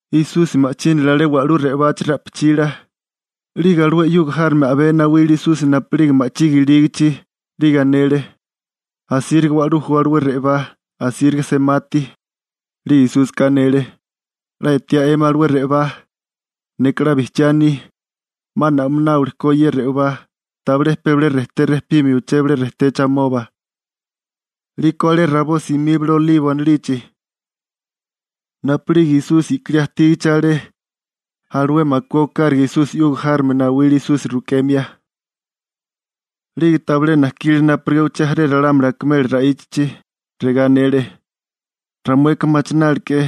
Esusi ma'chínale alé wa'lú re'obachi ra'pichila, 'lige alué 'yuga járome a'bé nawile Esusi napu'lige ma'chige ilígichi, 'lige anele: ―Asíriga wa'lú ju alué re'obá, asíriga semati. 'Lige Esúsika anele: ―¿'La etiá 'emi alué re'obá? Neka 'la bijchiá aní, 'ma na'mináwili ko ye re'obá. Tabilé pe bilé rejté rejpimio uché bilé rejtechi amoba. 'Liko alé rabó simíbale Olibo anilichi. Napu'lige Esusi i'kilí ajtígachi alé alué makué okáraga Esusi 'yuga járome nawile Esusi rukemia. 'Lige tabilé najkile napurigá uché jaré ralámuli akimela ra'íchachi. Regá anele: ―Ramueka machinálilike'é,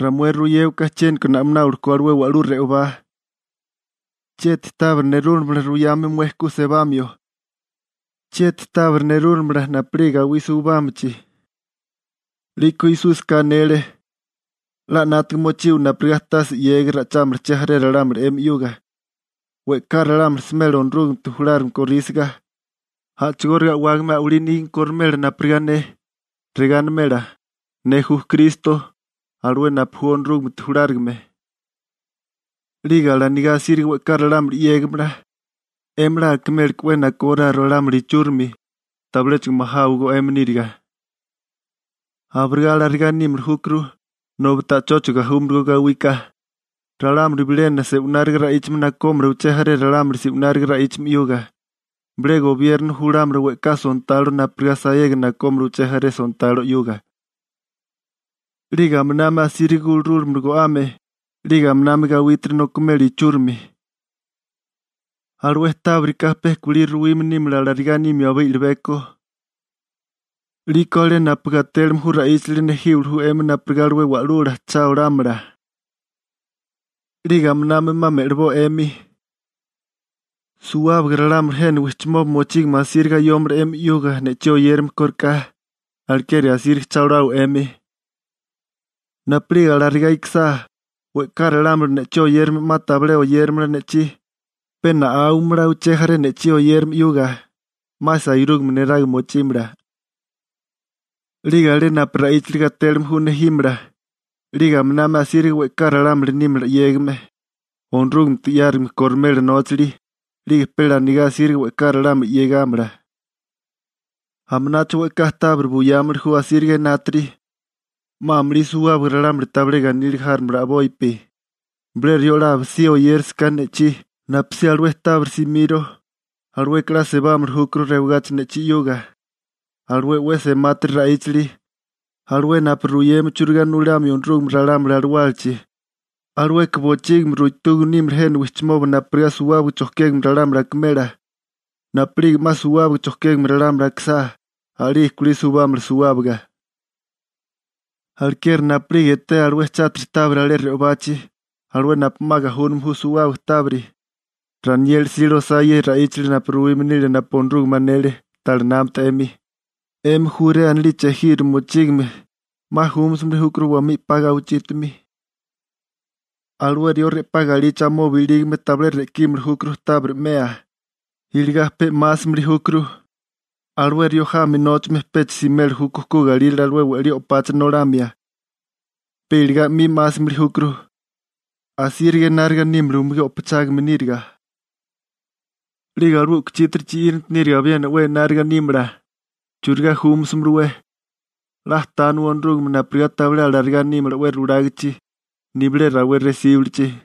ramué ruyéwaká chiéniko na'mináwili ko alué wa'lú re'obá. ¿Chieti tábiri nerúlamala ruyame mué ku sebamio? ¿Chieti tábiri nerúlamala napu'lige gawí suibámichi? 'Liko Esúsika anele: ―'La 'nátiga mochiwa napurigá tase 'yégiga ra'ichámala che jaré ralámuli 'emi 'yuga. We'ká ralámuli smela Onorúgamete julárigame korísiga, a'chigóriga a'wágame a'walí nígame korimela napurigá ne. Regá animela: «Ne ju Kristo, alué napu ju Onorúgamete julárigame.» 'Lige alanigá asíriga we'ká ralámuli 'yégamala. 'Emi 'la akiméleké 'we nakóráo ralámuli ichúrimi, tabiléchigo majáwagó 'emi níriga. Abirigá alarigá nímili júkuru, nobi ta'chóchigo gajúmalagó gawíká. Ralámuli bilena se'wináriga ra'íchame nakómala uché jaré ralámuli se'wináriga ra'íchame 'yuga. Bilé gobierno julámala we'ká sontalo napurigá sayega nakómala uché jaré sontalo 'yuga. 'Lige aminami asíriga gurúlamala go'ame. 'Lige aminami gawítiri nokimela ichúrimi. Alué tábirika pe kulí 'la ruwime nímala alarigá nimio abé i'libeko. › 'Liko alé napu gatélime ju ra'íchali nejíwili ju 'emi napurigá alué wa'lula cha olámala. 'Lige aminami 'ma me'liboa 'emi. Suwábaga ralámuli jena wijchimoba mochígame asíriga ayómala 'emi 'yuga ne'chí oyérame kóriká, alekeri asíriga cha olawa 'emi. Napu'lige alarigá ikisá, we'ká ralámuli ne'chí oyérame 'ma tabilé oyéramala ne'chí, pe na'áwamala uché jaré ne'chí oyérame 'yuga, 'ma sairúgame neraga mochímala. 'Lige alé napu ra'íchali gatélime ju nejímala. 'Lige aminami asíriga we'ká ralámuli nímala 'yégame. Onorúgamete 'yárigame korimela nóchali, 'lige pe lanigá asíriga we'ká ralámuli 'yégamala. Aminacho we'ká tábiri buyámili ju asíriga enátiri. 'Ma amulí suwábaga ralámuli tabilé ganíliga járomala a'bopi. Bilé rió 'la abisibi oyérasaká ne'chí napusí alué tábiri simiro, alueka 'la sebámili júkuru rewagachi ne'chí 'yuga. Alué 'we semátiri ra'íchali, alué napu ruyeme churigá nulamio Onorúgame ralámuli alawálachi, alueka bochígimi ruitúgame nímala jena wijchimoba napurigá suwábaga chojkégame ralámuli akimela. Napu'lige 'ma suwábaga chojkégame ralámuli akisá, a'lige kulí suibámala suwábaga. › Alekeri napu'lige etea alué chátiri tábiri alé re'obachi, alué napu 'ma gajúname ju suwábaga tábiri (Ranieli 'sile osá ye ra'íchali napu ruwime nile napu Onorúgame anele, ta'lá námata 'emi.), 'emi Jurea anilichi ejiro mochígame, 'ma júmasimili júkuru wamí 'pami rabó. Alué rió re'pá galichí amoba ilígame tabilé re'kínimili júkuru tábiri 'mea, iligá pe 'másimili júkuru. Alué rió jami nóchame pecha simeli júkó ku galírale alué we'lí o'pacha nolamia, pe iligá 'mi 'másimili júkuru. ¡Asíriga enáriga nímala umugí o'pachágame níriga! ¡'Lige alué u'kuchítiri chi'íranti níriga abiena 'we enárigá nímala! ¿Churigá júmasamalawé? 'La tániwa Onorúgame napurigá tabilé alarigá nímala 'we rulágachi, nibilé rawé resíbilichi.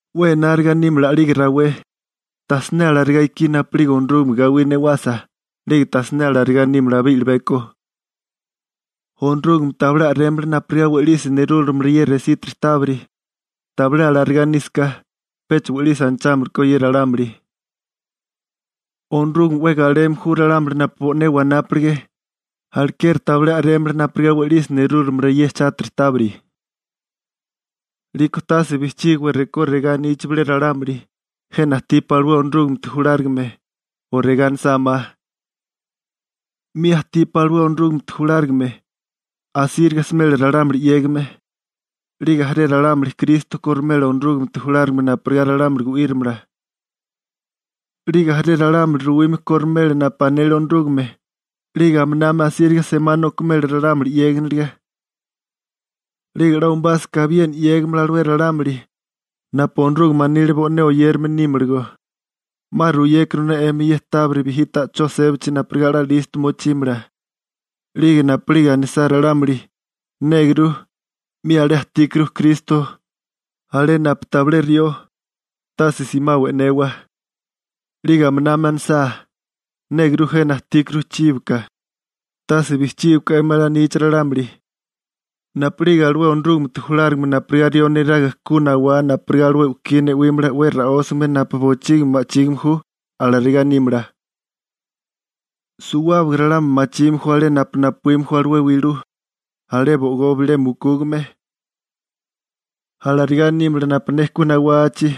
'We enárigá nímala a'lige rawé. Tajsiné alarigá ikí napu'lige Onorúgame gawí newasa, 'lige tajsiné alarigá nímala abé i'libeko. Onorúgame tabilé a'rémala napurigá we'lisi nerúlamala ye resítiri tábiri. Tabilé alarigá nísaká, pecha we'lisi anachámili ko ye ralámuli. Onorúgame 'we galeme ju ralámuli napu bo'né wanápilige, alekeri tabilé a'rémala napurigá we'lisi nerúlamala ye chátiri tábiri. › 'Liko tase bijchígiwa rekó regá anichi bilé ralámuli: «Jena ajtípá alué Onorúgamete julárigame», o regá anisá ma: «'Mi ajtípá alué Onorúgamete julárigame.» Asíriga smela ralámuli 'yégame. 'Lige jaré ralámuli Kristo korimela Onorúgamete julárigame napurigá ralámuli gu'írimala. 'Lige jaré ralámuli ruwime kolimela napu anele Onorúgame, 'lige aminami asíriga semá nokimela ralámuli 'yéginiliga. 'Lige 'la umabásaká abiena 'yégimala alué ralámuli napu Onorúgame anile bo'né oyérame nímalagó. 'Ma ruyékuru ne 'emi ye tábiri bijí ta'chó sébachi napurigá 'la listo mochímala. 'Lige napu'lige anisá ralámuli: «Néguru, 'mi alé ajtíkuru Kristo alé napu tabilé rió», tase simawa e'newa. 'Lige aminami anisá: «Néguru, jena ajtíkuru chíboka», tase bijchígiwaká 'emi alanichi ralámuli. Napu'lige alué Onorúgamete julárigame napurigá rió neraga ku nawá napurigá alué u'kí ne'wílala 'we ra'ósame napu bochígimi ma'chígime ju, alarigá nímala. Suwábaga ralámuli machime ju alé napu napuíme ju alué wilú, alé bo'igó bilé mukúgame. Alarigá nímala napu ne ku nawachi,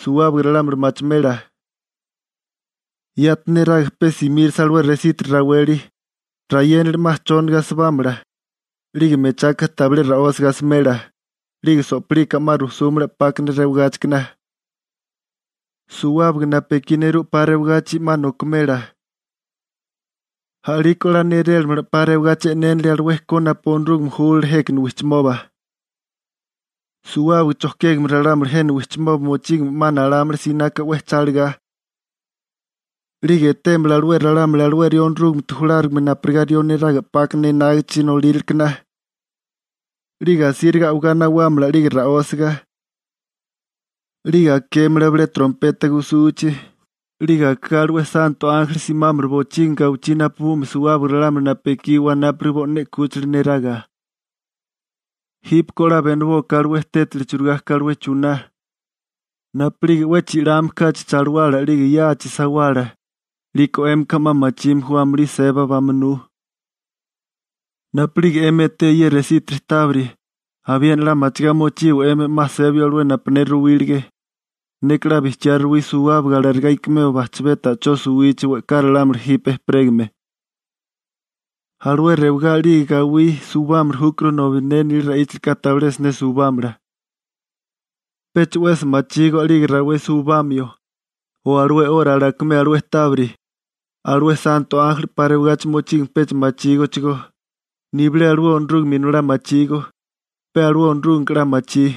suwábaga ralámuli machimela. › Yati neraga pe simírisa alué resítiri raweli, rayénali 'ma chóniga asibámala, 'lige mechaka tabilé ra'ósiga asimela, 'lige so'plika 'ma rujsúmala 'pákana rewagáchikana. Suwábaga napu ekí nerú 'pa rewagachi 'ma nokimela. A'liko 'la nélélamala 'pa rewagachi e'nénilia alué ko napu Onorúgame júlale jékana wijchimoba. Suwábaga chojkégame ralámuli jena wijchimoba mochígame 'ma nalámala sinaka 'we cha lagá. 'Lige etémala alué ralámuli alué rió Onorúgamete julárigame napurigá rió neraga 'pákana enágichi nolíralekana. 'Lige asíriga a'wagá nawámala 'lige ra'ósaga. 'Lige akémala bilé trompeta gusuchi, 'lige akigá alué santo ánjeli simámala bochígimi gawichí napabumia suwábaga ralámuli napu ekí wanápilige bo'né 'kúchila neraga. › Jípeko 'la benibóká alué tétali churigá ka alué chuná: Napu'lige 'we chi'lame kachi chalawala 'lige yáachi sawala, 'liko 'émika 'ma machime ju amulí seba bamunú. Napu'lige 'emi etea ye resítiri tábiri, abiena 'la machigá mochiwa 'emi 'ma sebio alué napu ne ruwílige. Neka 'la bijchiá ruwí suwábaga alarigá ikimeo bajchabé ta'chó suwichi we'ká ralámuli jipe ejperégame. Alué rewagá 'lige gawí suwibámili júkuru, ne nila ra'íchalika tabiléchigo siné suwibámalagó. › Pecha 'wesi machígó a'lige rawé suwibamio, o alué 'ora alakimeo alué tábiri. Alué santo ánjeli 'pa rewagachi mochígame pecha machígóchigó, nibilé alué Onorúgame Inolá machígó, pe Onorúgameka 'la machí. ›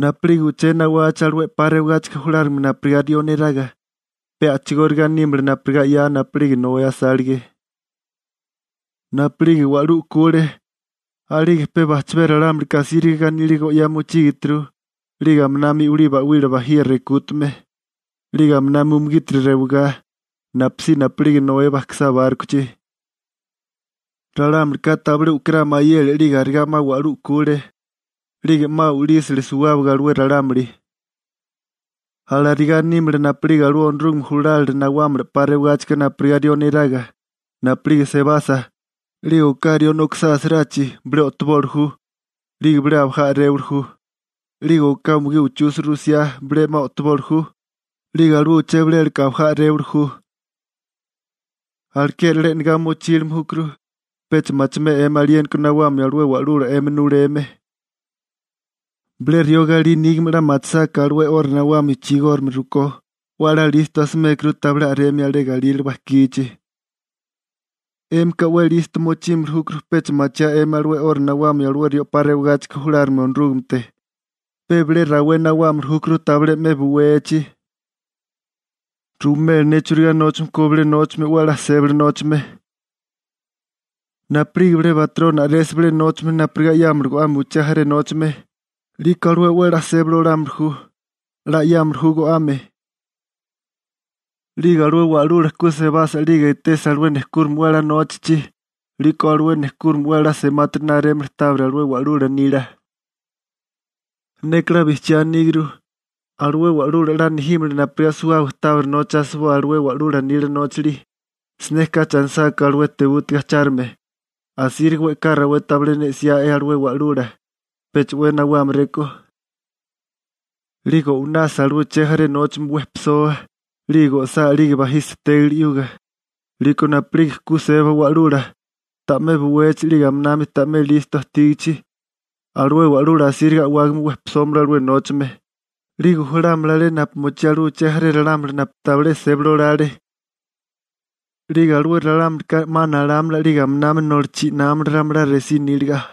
Napu'lige uché nawachi alué 'pa rewagáchika julárigame napurigá rió neraga, pe a'chigóriga nímala napurigá 'ya napu'lige Noé asálige. Napu'lige wa'lú u'kule, a'lige pe bajchabé ralámulika asíriga ganíliga go'yá mochígeturu 'lige aminami i'wilí ba'wila bajiga rekútame, 'lige aminami umugítiri rewigá, napusí napu'lige Noé bajkisá bárkochi. Ralámulika tabilé u'kirá mayele 'lige arigá 'ma wa'lú u'kule, 'lige 'ma u'lísale suwábaga alué ralámuli. Alarigá nímala napu'lige alué Onorúgame julálila nawámala 'pa rewagáchika napurigá rió neraga. Napu'lige sebasa, 'lige oká rió nokisá asarachi, bilé o'toboli ju, 'lige bilé abajá a'réwili ju. 'Lige oká umugí uchusa rusiá bilé 'ma o'toboli ju, 'lige alué uché bilélaka abajá a'réwali ju. › Alekeri 'la e'negá mochílime júkuru, pecha machimea 'emi aliéniko nawamio alué wa'lula 'emi nuleme. Bilé rió galí nígame 'la machisáká alué 'ora nawamio chigórigame rukó, 'we a'lá listo asimékuru tabilé a'remia alé galírale bajkichi. 'Émika 'we listo mochímili júkuru pecha machiá 'emi alué 'ora nawamio alué rió 'pa rewagáchika julárigame Onorúgamete, pe bilé rawé nawámili júkuru tabilé 'me buwechi. › Ruwimé ne churigá nóchame ko bilé nóchame 'we a'lá sébali nóchame. Napu'lige bilé batroni a'resa bilé nóchame napurigá 'yámala go'ame uché jaré nóchame, 'liko alué 'we a'lá sébali olámili ju. 'La 'yámili ju go'ame. 'Lige alué wa'lula ku sebasa 'lige etesa alué nejkúrime 'we a'lá nóchachi, 'liko alué nejkúrime 'we a'lá semátiri narémala tábiri alué wa'lula nila. Neka 'la bijchiá aníguru, alué wa'lula 'la nejímala napurigá suwábaga tábiri nocha asiboa alué wa'lula nila nóchali. Siné kachi anisáká alué tebútiga ajchárigame: «Asíriga we'ká rawé tabilé ne 'siá'é alué wa'lula. Pecha 'we nawámaréko.» 'Lige o'winasa alué che jaré nóchame wejpisoa, 'lige go'sá 'lige bajisa tégali 'yuga. 'Liko napu'lige ku seba wa'lula, ta'mé buwechi 'lige aminami ta'mé listo ajtígachi, alué wa'lula asíriga a'wágame wejpisómala alué nóchame, 'lige julámala alé napu mochí alué uché jaré ralámuli napu tabilé sébali olale. 'Lige alué ralámulika 'ma nalámala 'lige aminami nolo chi'námala ramalá resí níliga.